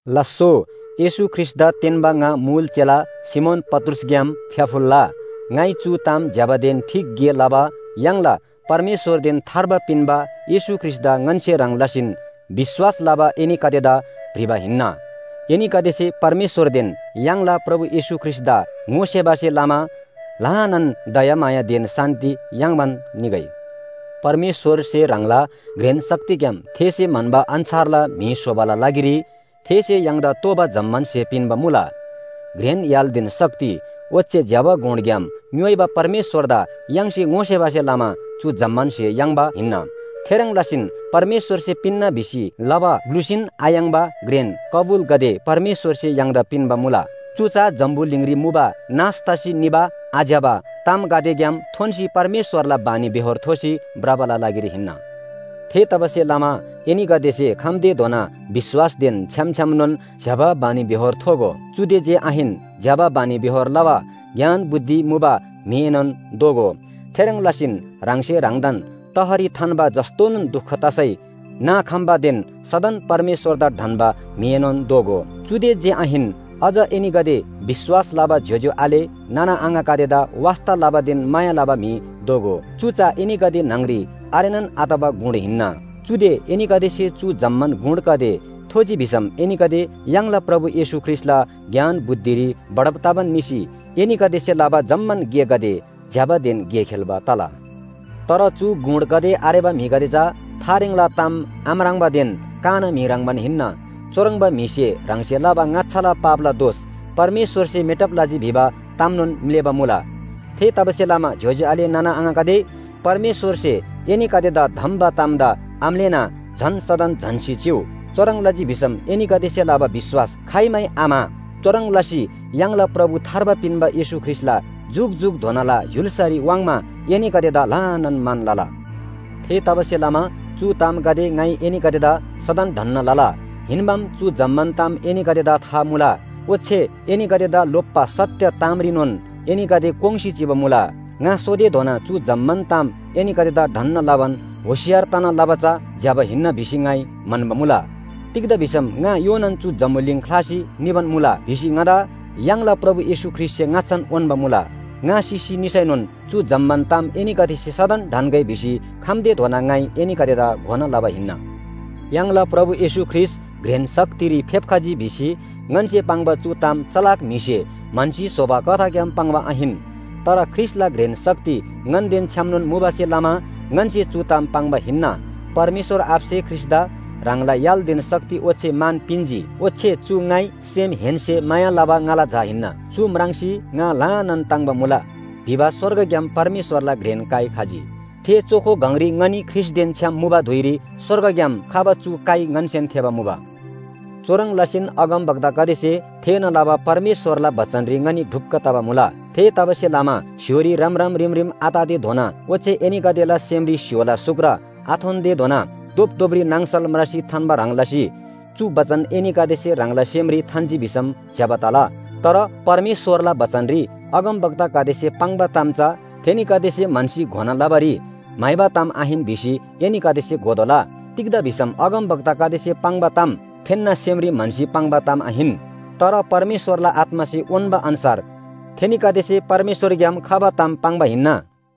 लास्‍सो, येशू ख्रीष्‍टदा तेन्‍बा ङा मुल चेला सिमोन पत्रुसग्‍याम फ्‍याफुल्‍ला। ङाइ चु ताम ज्‍यबादेन ठीक गे लबा य्‍हाङला परमेश्‍वरदेन थार्बा पिन्‍बा येशू ख्रीष्‍टदा ङन्‍से ह्रङ् लसीन विश्‍वास लबा एनीगदेदा भ्रिबा हिन्‍ना। एनीगदेसे परमेश्‍वरदेन य्‍हाङला प्रभु येशू ख्रीष्‍टदा ङोसेबासे लमा ल्‍हानान दयामायादेन शान्‍ति याङ्बान निगै। परमेश्‍वरसे ह्राङला घ्रेन शक्तिग्‍याम थेसे म्‍हन्‍बा अन्‍छारला म्‍हि स्‍होबाला लागिरी थेसे य्‍हाङदा तोःबा जम्‍मान स्‍हे पिन्‍बा मुला। घ्रेन य्‍हालदेन शक्ति ओच्‍छे ज्‍यबा गुणग्‍याम ङ्‌योइबा परमेश्‍वरदा य्‍हाङसे ङोसेबासे लमा चु जम्‍मान स्‍हे याङ्बा हिन्‍ना। थेह्रङ् लसीन परमेश्‍वरसे पिन्‍ना भिसी लबा ग्‍लुसीन आयाङ्बा घ्रेन कबुलगदे परमेश्‍वरसे य्‍हाङदा पिन्‍बा मुला। चु चा जम्‍बुलिङरी मुबा नाश तसी निबा आज्‍यबा तामगदेग्‍याम थोन्‍सी परमेश्‍वरला बानीबेहोर थोसी भ्रबाला लागिरी हिन्‍ना। थेतबासेलमा एनीगदेसे खम्‍तेधोना विश्‍वासदेन छ्‌याम छ्‌यामनोन ज्‍यबा बानीबेहोर थोगो। चुदे जे आहिन, ज्‍यबा बानीबेहोर लबा ज्ञान बुद्धि मुबा म्‍हिएनोन दोगो। थेह्रङ् लसीन ह्राङसे ह्राङदान तहरी थान्‍बा, जस्‍तोन दुख तसै नाखम्‍बादेन सदन परमेश्‍वरदा ढन्‍बा म्‍हिएनोन दोगो। चुदे जे आहिन, अझ एनीगदे विश्‍वास लबा ज्‍योज्‍यो आले नाना आङागदेदा वास्‍ता लबादेन माया लबा म्‍हि दोगो। चु चा एनीगदे न्‍हङरी आरेनान आतबा गुण हिन्‍ना, चुदे एनीगदेसे चु जम्‍मान गुणगदे थोजी भिसम एनीगदे य्‍हाङला प्रभु येशू ख्रीष्‍टला ज्ञान बुद्धिरी बढब तबान निसी एनीगदेसे लबा जम्‍मान गेगदे ज्‍यबादेन गे खेल्‍बा तला। तर चु गुणगदे आरेबा म्‍हिगदे चा थारेङला ताम आम्राङ्बादेन काना म्‍हि ह्रङ्‌बान हिन्‍ना। चुह्रङ्बा म्‍हिसे ह्राङसे लबा ङाच्‍छाला पापला दोष परमेश्‍वरसे मेटब लजी भिबा तामनोन म्‍लेःबा मुला। थेतबासेलमा ज्‍योज्‍यो आले नाना आङागदे, परमेश्‍वरसे एनीगदेदा धम्‍बा तामदा आम्‍लेःना झन सदन झन्‍सी चिउ। चुह्रङ् लजी भिसम एनीगदेसे लबा विश्‍वास खाइमै आम्‍हा। चुह्रङ् लसी य्‍हाङला प्रभु थार्बा पिन्‍बा येशू ख्रीष्‍टला जुकजुकधोनाला य्‍हुल्‍सारी वाङ्मा एनीगदेदा ल्‍हानान मान लला। थेतबासेलमा चु तामगदे ङाइ एनीगदेदा सदन ढन्‍ना लला। हिन्‍बाम, चु जम्‍मान ताम एनीगदेदा था मुला। ओच्‍छे एनीगदेदा लोप्‍बा सत्‍य तामरीनोन एनीगदे कोङ्‌सी चिबा मुला। ङा सोतेधोना चु जम्‍मान ताम एनीगदेदा ढन्‍ना लबान होशियार तना लबा चा ज्‍यबा हिन्‍ना भिसी ङाइ म्‍हन्‍बा मुला। तिग्‍दा भिसम ङा योनान चु जम्‍बुलिङ ख्‍लासी निबान मुला भिसी ङादा य्‍हाङला प्रभु येशू ख्रीष्‍टसे ङाच्‍छान उन्‍बा मुला। ङा सिसी निसैनोन चु जम्‍मान ताम एनीगदेसे सदन ढन्‍गै भिसी खम्‍तेधोना ङाइ एनीगदेदा घोना लबा हिन्‍ना। य्‍हाङला प्रभु येशू ख्रीष्‍ट घ्रेन शक्तिरी फेप्‍खजी भिसी ङन्‍से पाङ्बा चु ताम चलाक म्‍हिसे म्‍हन्‍सी स्‍होबा कथाग्‍याम पाङ्बा आहिन। तर ख्रीष्‍टला घ्रेन शक्ति ङन्‍देन छ्‌यामनोन मुबासे लमा ङन्‍से चु ताम पाङ्बा हिन्‍ना। परमेश्‍वर आबासे ख्रीष्‍टदा ह्राङला य्‍हालदेन शक्ति ओच्‍छे मान पिन्‍जी, ओच्‍छे “चु ङाइ सेमहेन्‍से माया लबा ङाला झा हिन्‍ना, चु म्राङ्सी ङा ल्‍हानान ताङ्‍बा मुला” भिबा स्‍वर्गग्‍याम परमेश्‍वरला घ्रेन काइ खजी। थे चोखो गङरी ङनी ख्रीष्‍टदेन छ्‌याम मुबा धुइरी स्‍वर्गग्‍याम खबा चु काइ ङन्‍सेन थेःबा मुबा। चुह्रङ् लसीन अगमवक्तागदेसे थेःना लबा परमेश्‍वरला बचनरी ङनी ढुक्‍क तबा मुला। थेतबासेलमा स्‍य्‍होरी रमरम रिमरिम आततेधोना ओच्‍छे एनीगदेला सेमरी स्‍य्‍होला सुक्र आथोन्‍तेधोना धोपधोपरी नाङसल म्रासी थान्‍बा ह्रङ् लसी चु बचन एनीगदेसे ह्राङला सेमरी थान्‍जी भिसम ज्‍यबा तला। तर परमेश्‍वरला बचनरी अगमवक्तागदेसे पाङ्बा ताम चा थेनीगदेसे म्‍हन्‍सी घोना लबारी म्‍हाइबा ताम आहिन भिसी एनीगदेसे घोतोःला। तिग्‍दा भिसम अगमवक्तागदेसे पाङ्बा ताम थेन्‍ना सेमरी म्‍हन्‍सी पाङ्बा ताम आहिन। तर परमेश्‍वरला आत्‍मासे उन्‍बा अन्‍छार थेनीगदेसे परमेश्‍वरग्‍याम खबा ताम पाङ्बा हिन्‍ना।